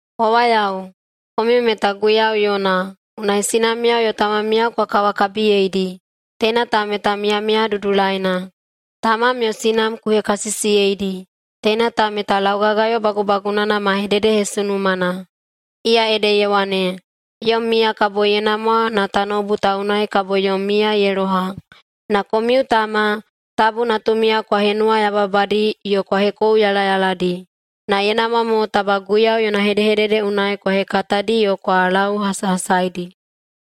Wawayao, komiu meta Guiyau yona, unai sinamiyao yo tamamiyao kwa kawakabiyeidi. Teina ta meta miyamiya dudulaina. “Tamam yo sinam ku hekasisiyeidi.” Teina ta meta laugagayo bagubagunana ma hededehesunumana, iya ede ye wane, “Yom miya kabo ye namwa na tanoubu ta unai kabo yom miya ye loha.” Na komiu tama, tabu natumiyao kwa henuwayababadi yo kwa hekouyalayaladi, na ye namwa mo taba Guiyau yona hedehedede unai kwa hekatadi yo kwa lauhasahasaidi.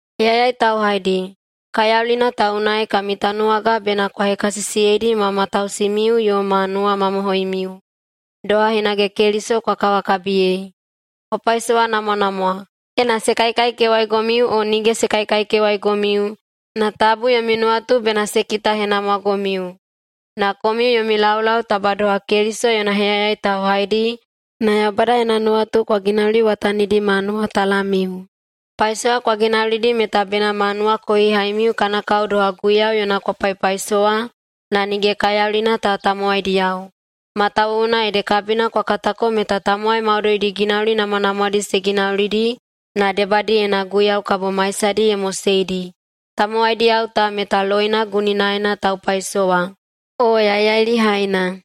Heyayai tauhaidi, kaiyaulina ta unai kami tanuwaga bena kwa hekasisiyeidi ma matausimiu yo ma nuwamamohoimiu, doha hinage Keliso kwa kawakabiyei. Kwa paisowanamwanamwa, ena se kaikaikewaigomiu o nige se kaikaikewaigomiu, na tabu yomi nuwatu bena se kitahenamwagomiu. Na komiu yomi laulau taba doha Keliso yona heyayai tauhaidi na Yaubada yona nuwatu kwa ginauliwatanidi ma nuwatalammiu. Paisowa kwa ginaulidi meta bena ma nuwakohihaimiu kana kao doha Guiyau yona kwa paipaisowa na nige kaiyaulina ta tamowaidiyao, matawuwuna ede kabina kwa katako meta tamowai maudoidi ginauli namwanamwadi se ginaulidi na debadiyena Guiyau kabo maisadi ye moseidi, tamowaidiyao ta meta loina guninaena taupaisowa, o yaiyailihaina.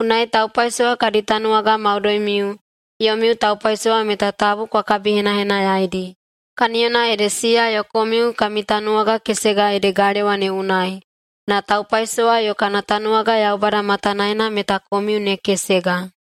Unai taupaisowa kadi tanuwaga maudoimiu, yomiu taupaisowa meta tabu kwa kabikabihenahenayaidi, kaniyona ede siya yo komiu kami tanuwaga kesega ede galewa ne unai, na taupaisowa yo kana tanuwaga, Yaubada matanaena meta komiu ne kesega.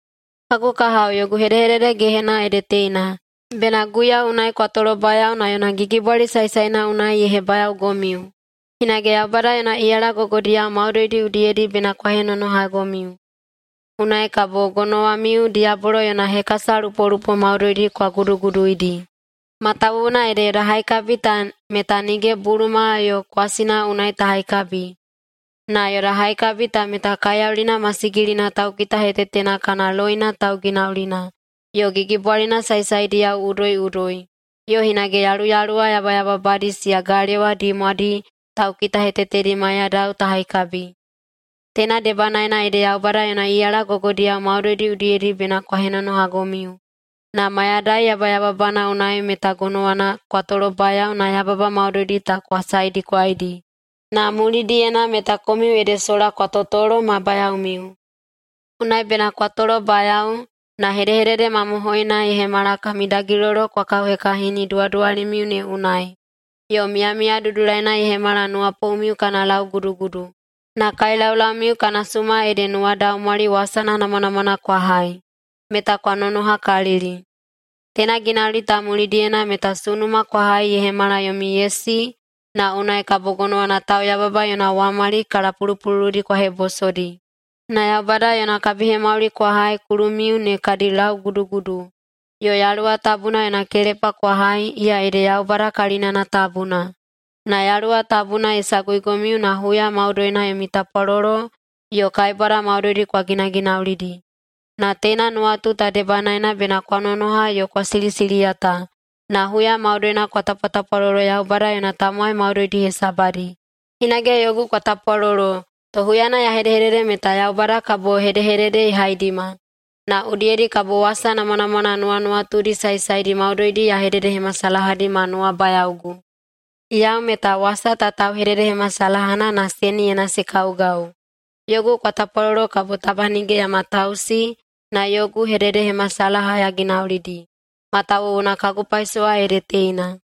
Kagu kahao, yogu hedehedede gehena ede teina: Bena Guiyau unai kwa tolobayao na yona gigibwali saesaena unai ye hebayaogomiu. Hinage Yaubada yona iyala gogodiyao maudoidi udiyedi bena kwa henonohagomiu. Unai kabo gonowamiu diyabolo yona hekasalupolupo maudoidi kwa guduguduidi. Matawuwuna ede yoda haikabi ta meta nige buluma yo kwasina unai ta haikabi. Na yoda haikabi ta meta kaiyaulina masigilina taukitahetetena kana loina tauginaulina, yo gigibwalina saesaediyao udoiꞌudoi, yo hinage yaluyaluwa yabayababadi siya galewa dimwadi taukitahetetedi maiyadao ta haikabi. Teina debanaena ede Yaubada yona iyala gogodiyao maudoidi udiyedi bena kwa henonohagomiu, na mayadai yabayababana unai meta gonowana kwa tolobayao na yababa maudoidi ta kwa saedikwaidi, na mulidiyena meta komiu ede sola kwa totolo ma bayaomiu. Unai bena kwa tolobayao, na hedehedede mamohoina ye hemala kami dagilolo kwa kauhekahini duwaduwalimiu ne unai, yo miyamiya dudulaina ye hemala nuwapoumiu kana laugudugudu, na kaelaulaumiu kana suma ede nuwadaumwali wasana namwanamwana kwa hai, meta kwa nonohakalili. Teina ginauli ta mulidiyena meta sunuma kwa hai ye hemala yomi yesi na unai kabo gonowana tauyababa yona wamali kalapulupululudi kwa hebosodi. Na Yaubada yona kabihemauli kwa hai kulumiu ne kadi laugudugudu, yo Yaluwa Tabuna yona kelepa kwa hai, iya ede Yaubada kalinana tabuna. Na Yaluwa Tabuna ye saguigomiu na huya maudoina yomi tapwalolo yo kaibwada maudoidi kwa ginaginaulidi. Na teina nuwatu ta debanaena bena kwa nonoha yo kwa silisiliyata na huya maudoina kwa tapwatapwalolo Yaubada yona tamowai maudoidi hesabadi. Hinage yogu kwa tapwalolo, to huyana ya hedehedede meta Yaubada kabo hedehedede ye haidima, na udiyedi kabo wasa namwanamwana nuwanuwatudi saesaedi maudoidi ya hededehemasalahadi ma nuwabayaogu. Yau meta wasa ta tauhededehemasalahana na seniyena se kaugau. Yogu kwa tapwalolo kabo taba nige ya matausi na yogu hededehemasalaha ya ginaulidi, matawuwuna kagu paisowa ede teina.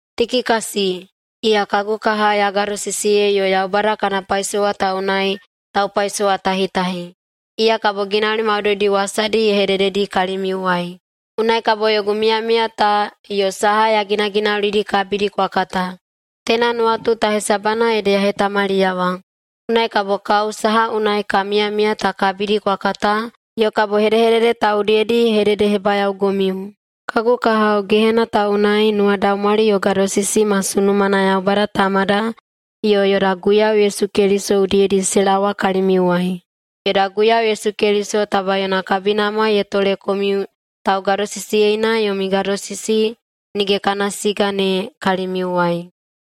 Tikikasi, iya kagu kaha ya gadosisiyei yo Yaubada kana paisowa ta unai taupaisowatahitahi, iya kabo ginauli maudoidi wasadi ye hedededi kalimiuwai, unai kabo yogu miyamiya ta yo saha ya ginaginaulidi kabidi kwa kata. Teina nuwatu ta hesabana ede ya hetamaliyawa, unai kabo kao saha unai ka miyamiya ta kabidi kwa kata yo kabo hedehedede ta udiyedi ye hededehebayaogomiu. Kagu kahao, [gehena ta unai], nuwadaumwali yo gadosisi ma sunumana Yaubada Tamada yo yoda Guiyau Yesu Keliso udiyedi se laowa kalimiuwai. Yoda Guiyau Yesu Keliso taba yona kabinamwa ye tole komiu taugadosisiyeina yomi gadosisi nige kana siga ne kalimiuwai.